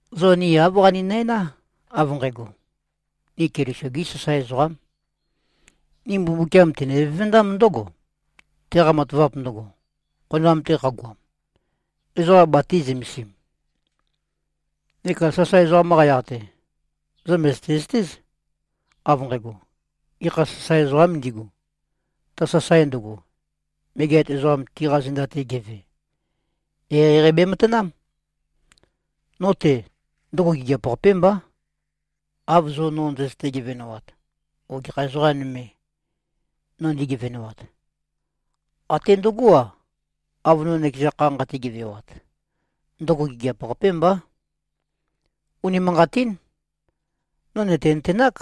Zo ni āv qaninæná, av nqægo: Ni Keliso-gí sasae ezoqám. Ni Mbumbukiam tene-vevendám ndǿgo, teqa matavap ndøgo, khonoam-te qagoam, ezoqa batī-zømesim. Neka sasae ezoqam-qa yaq-te, zo mø̀zøte-zøtéz, av nqægo: Gekha sasae ezoqām ndigu, ta sasae ndøgo, megeat ezoqam tiqa zenda-te geve, eqeieqei bematanám. No-te, ndøgo gigiap-qapé mbá, av zo no ndøzøte-gevenoat o gekha ezoqa nøme, no ndi꞉gevenoat. Até ndøgó-a, av no nøkeza kha nqate-gevewat, ndøgo gigiap-qapé mbá. Unimanqatín. No nø̀tenøtenák,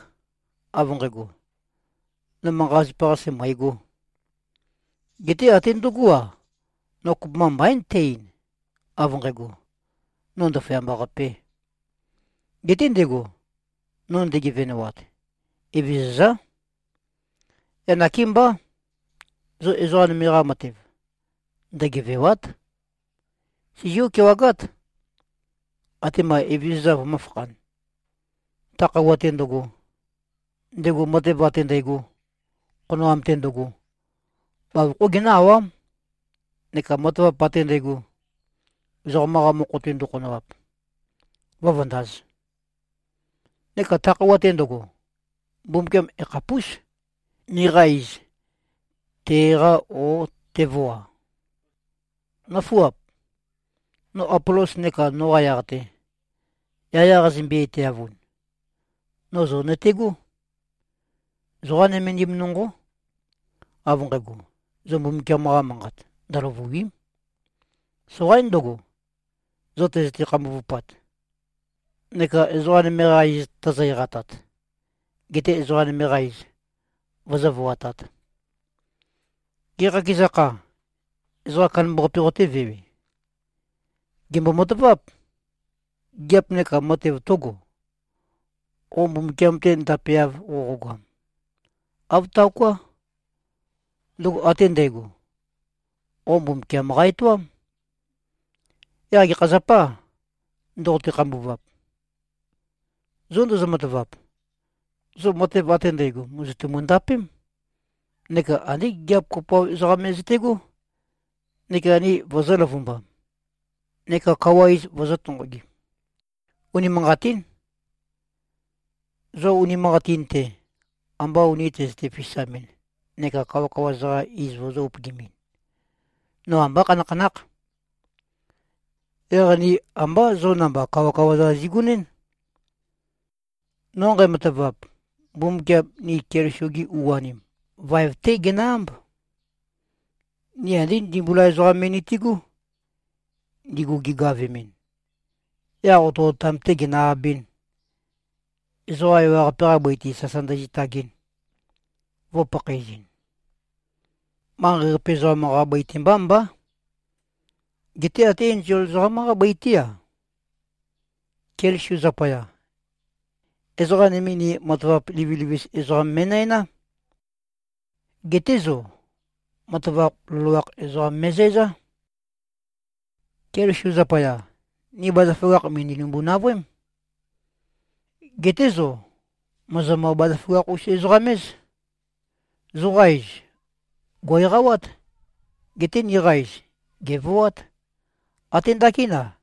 av nqægo, no manqa-zapa-qase mø̀egō. Geté até ndøgó-a, no kopømba mbaín tæ-ein, av nqægo, “No ndaføyamba-qapē.” Geté ndego, no nde꞉gevenoat, Evezøzá. Yaq nakémbá. Zo ezoqa nøme-qa matev, ndøgevèwa᷄t. Sizió-kewagát, atema Evezøza vømǿfakhān. Ta khøuwa-te ndøgo, ndego matev ate ndægo, khonoam-te ndøgo, bavokhó genǿ-awám, neka matavap ate ndægo, ezoqam-qa mokho-te ndøkhonoap, vǿvøndāz. Neka ta khøuwa-te ndøgo, Mbumbukiam yakhapús, niqa iz te-èqā, ó, tevoa. Nǿfuap! No Apolos neka noqa yaq-te, yaya qazømbe-etæavun, no zo nøtegó. Zoqá nømendim nonqó, av nqægo, zo Mbumbukiam-qa Manqat ndøløvùi᷄m. Soqaín ndøgo, zo tøzøte-khambuvupat, neka ezoqa nøme-qa iz tozo-eqatat, gete ezoqa nøme-qa iz, vozó-voatāt. Gê, qakeza kha, ezoqa kandambaqape qotévewe? Gèmbo-mataváp. Gigiap neka matev tǿgo, qo Mbumbukiam-te ndapeav qoqogoam? Āv taoká. Ndøgo ate ndægo, qo Mbumbukiam qa-etoám. Yaq gekha zapâ, ndoqote-khambuvap? Zo ndozo-matavap, zo matev ate ndægo mòzotumu-ndapém neka andé gigiap kopoav ezoqa me zøte꞉gó neka ni vozō-løvumbam neka kawa iz vozō-tonqogim. Unimanqatín. Zo unimanqatin-te, amba uni tøzøte-fisamɨn neka kawakawa-za-qa iz vozō-upøgimɨn, no ambá khanakhanákh. Yaq ni ambá zo namba kawakawa-za zigonɨ́n. No nqæmatavap, Mbumbukiam ni Keliso-gi u-anim, vaev-té genø-ámb. Ni andé ndimbula ezoqam me nitigú, ndigu gigavemɨn, yaq otøotam-tē ginø-abɨ̄n, ezoqa ewaqape-qa bøi-te sasa ndøzitagɨn, vø̄pakhaezɨn. Manqei-qape ezoqam-qa bøi-te mbá mbá, geté até enzol ezoqám-qá bøi-te-á. Keliso zapaya, ezoqa nøme ni matavap livilivis ezoqam mi꞉næná. Geté zo, matavap loloakh ezoqam me꞉zæzá. Keliso zapaya, ni bazaføgakh, mø̀ndønimbu-navøém. Geté zo mòzomø-bazaføgakh-us-ezoqam-éz. Zoqa iz, gò꞉-eqawát. Geté niqa iz, gèvoát. Até ndakín-a,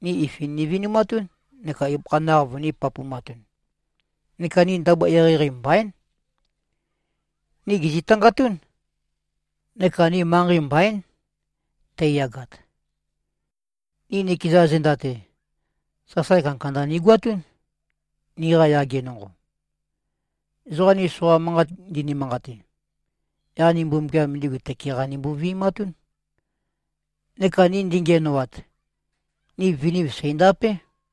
ni ifin nivinumatún neka ibøkha naq vønī-papumatun. Neka ni ndabua eqeieqei mbaín. Ni gèzitangatún. Neka ni manqei mbaín, teiyagat. Ni nikeza zenda-te, sasae kandakanda nigoatún, niqa yage nonqo. Ezoqa ni soqa manqat ndini-manqate, yaq ni Mbumbukiam ndigu tøke-qa nimbo-vi꞉matún. Neka ni ndingiænoat, ni viniv, seìndapé.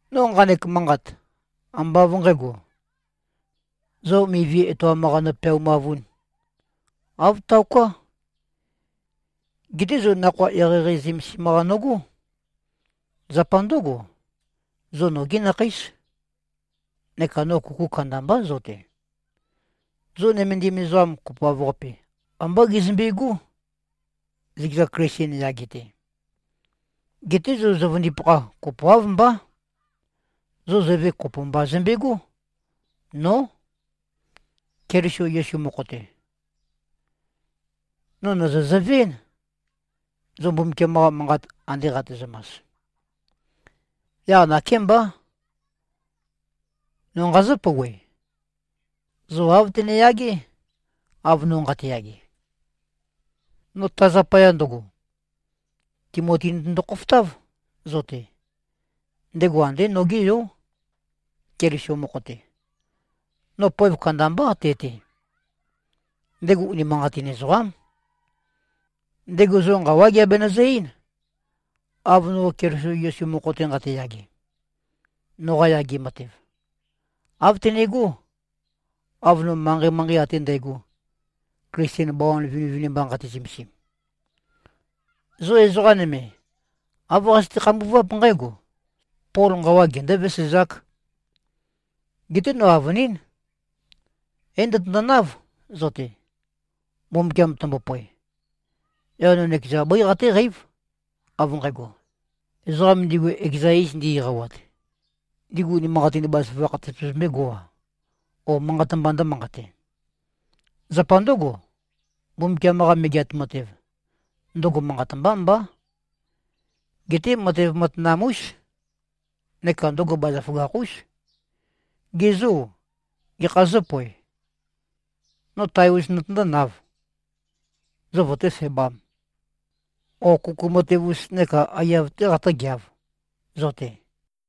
No nqanek manqat, ambá av nqǣgo, zo mivi etoam-qa nopeaumavūn. Āv taoká. Geté zo nakhoa eqeieqei zømesim-qa nogó. Zapa ndǿgo, zo nogí nakheís. Neka no kuku kandambá zo-te. Zo nømendim ezoqam kopoav-qape, ambá gezømbigú, zøkeza Klisten yage-te. Geté zo zøvøndipakha, kopoáv mbá. Zo zøve kopo mba zømbegó. Nó. Keliso Yesu mokho-te, no nøzø-zøve-én, zo Mbumbukiam-qa Manqat ande qatezømas. Yaq nakémbá, no nqazǿ-pouwe: Zo āv tøneyagé, av no nqateyage. No ta zapaya ndøgo, Timoti notøndo-khofotáv, zo-te. Ndego andé nogé yó, Keliso mokho-te. No poev kandambá te-te. Ndego unimanqatin ezoqám. Ndego zo nqawá geabenøzø-eín, av no Keliso Yesu mokho-te nqateyage. Noqa yage matev, āv tøne꞉gó, av no manqei-manqei ate ndægo, Klisten bawan vinivinimba nqate-zømesim. Zo ezoqa nøme, āv qazøte-khambuváp nqǽgo: Pol nqawa gendō-vesezāk. Geté no avønín, é-ndøtøndonáv, zo-te, Mbumbukiam tømbopoe. Yaq no nøkeza bøí qatéqeív, av nqægo: Ezoqam ndigu ekeza iz ndi-eqawat, ndigu unimanqatin bazaføgakh tøpøzømbégo-a, ó, manqat mbā ndǿmanqate. Zapa ndǿgo, Mbumbukiam-qa Megeat Matev, ndøgo manqat mbá mbá. Geté matev matanam-ús. Neka ndøgo bazaføgakh-ús. Ge zô, gekhā zǿpoev? No tae-us notøndónāv, zo vøtéfebām, ó, kuku matev-us neka aiyav-tē qatǿgeāv, zo-te?